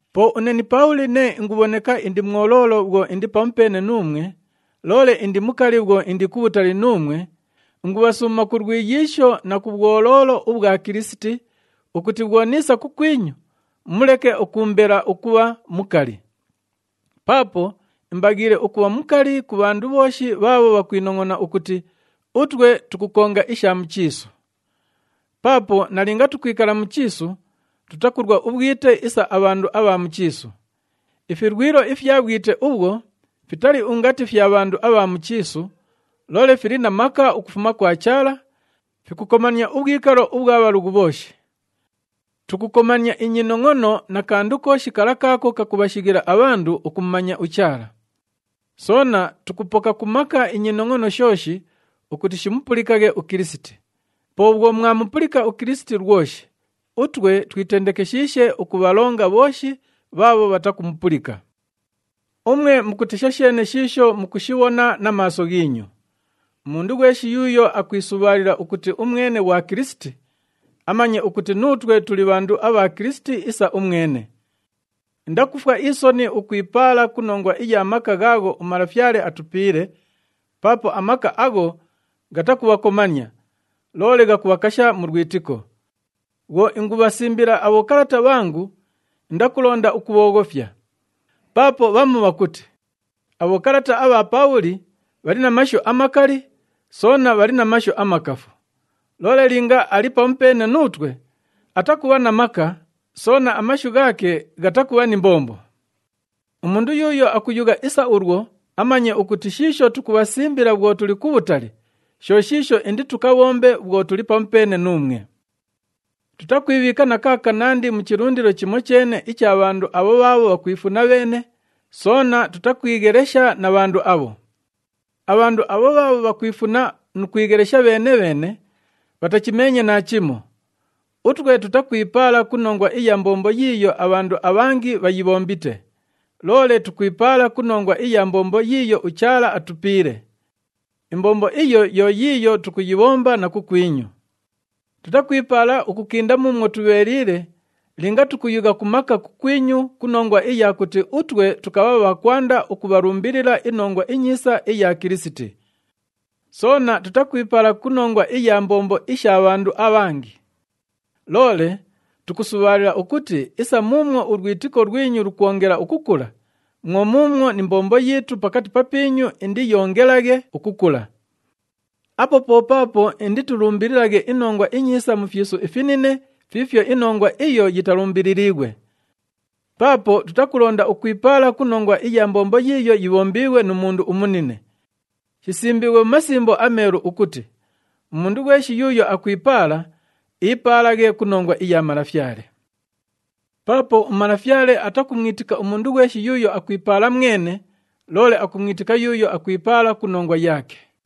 Po une ni Paabhuli nee ingubhoneka indi mwoloolo bhwo indi pamupeene nuumwe, loole indi mukali bhwo indi kubhutali nuumwe, ingubhasuuma ku lwiyiisho na ku bhwoloolo ubhwa Kilisiti, ukuti bhwo niisa kukwinyu, muleke ukuumbela ukubha mukali. Paapo imbaghiile ukubha mukali ku bhandu bhooshi bhaabho bhakwinongʼona ukuti utwe tukukonga isha mu chiisu. Paapo nalinga tukwikala mu chiisu, tutakulwa ubhwite isa abhandu abha mu chiisu. Ifilwilo ifya bhwite ubhwo fitali ungati fya bhandu abha mu chiisu, loole fili na maka ukufuma kwa Chaala, fikukomania ubhwikalo ubhwa bhalughu bhooshi. Tukukomania inyinongʼono na kandu kooshi kala kaako kakubhashighila abhandu ukumumanya uChaala. Soona tukupoka ku maka inyinongʼono shooshi ukuti shimupulikaghe uKilisiti. Po bhwo mwamupulika uKilisiti lwoshi, utwe twitendekeshiishe ukubhalonga bhooshi bhaabho bhatakumupulika. Umwe mukutesha sheene shiisho mukushibhona na maaso ghiinyu. Umundu ghweshi yuuyo akwisubhaalila ukuti umwene ghwa Kilisiti, amanye ukuti nuutwe tuli bhandu abha Kilisiti isa umwene. Indakufwa isoni ukwipaala ku nongwa iya maka ghaagho uMalafyale atupiile, paapo amaka agho ghatakubhakomania, loole ghakubhakasha mu lwitiko. Bhwo ingubhasimbila abhokalata bhangu, indakulonda ukubhooghofya. Paapo bhamu bhakuti, “Abhokalata abha Paabhuli bhali na mashu amakali, soona bhali na mashu amakafu. Loole linga ali pamupeene nuutwe, atakubha na maka, soona amashu ghaake ghatakubha ni mbombo.” Umundu yuuyo akuyugha isa ulwo amanye ukuti shiisho tukubhasimbila bhwo tuli kubhutali, sho shiisho inditukabhombe bhwo tuli pamupeene nuumwe. Tutakwibhiika na kaakanandi mu chilundilo chimocheene icha bhandu abho bhaabho bhakwifuna bheene, soona tutakwighelesha na bhandu abho. Abhandu abho bhaabho bhakwifuna nu kwighelesha bheene-bheene, bhatachimeenye naachimo. Utwe tutakwipaala ku nongwa iya mbombo yiiyo abhandu abhangi bhayibhombite, loole tukwipaala ku nongwa iya mbombo yiiyo uChaala atupiile. Imbombo iyo yo yiiyo tukuyibhomba na kukwinyu. Tutakwipaala ukukinda muumwo tubheeliile linga tukuyugha ku maka kukwinyu ku nongwa iya kuti utwe tukabha bha kwanda ukubhalumbilila iNongwa iNyiisa iya Kilisiti. Soona tutakwipaala ku nongwa iya mbombo isha bhandu abhangi. Loole tukusubhaalila ukuti isa muumwo ulwitiko lwinyu lukwongela ukukula, mwo muumwo ni mbombo yiitu pakati papiinyu indiyoongelaghe ukukula. Apo po paapo inditulumbililaghe iNongwa iNyiisa mu fyisu ifinine fiifyo inongwa iyo yitalumbililiighwe. Paapo tutakulonda ukwipaala ku nongwa iya mbombo yiiyo yibhombiighwe nu mundu umunine. Shisimbiighwe mu Masimbo aMeelu ukuti, “Umundu ghweshi yuuyo akwipaala, iipaalaghe ku nongwa iya Malafyale.” Paapo uMalafyale atakumwitika umundu ghweshi yuuyo akwipaala mwene, loole akumwitika yuuyo akwipaala ku nongwa yaake.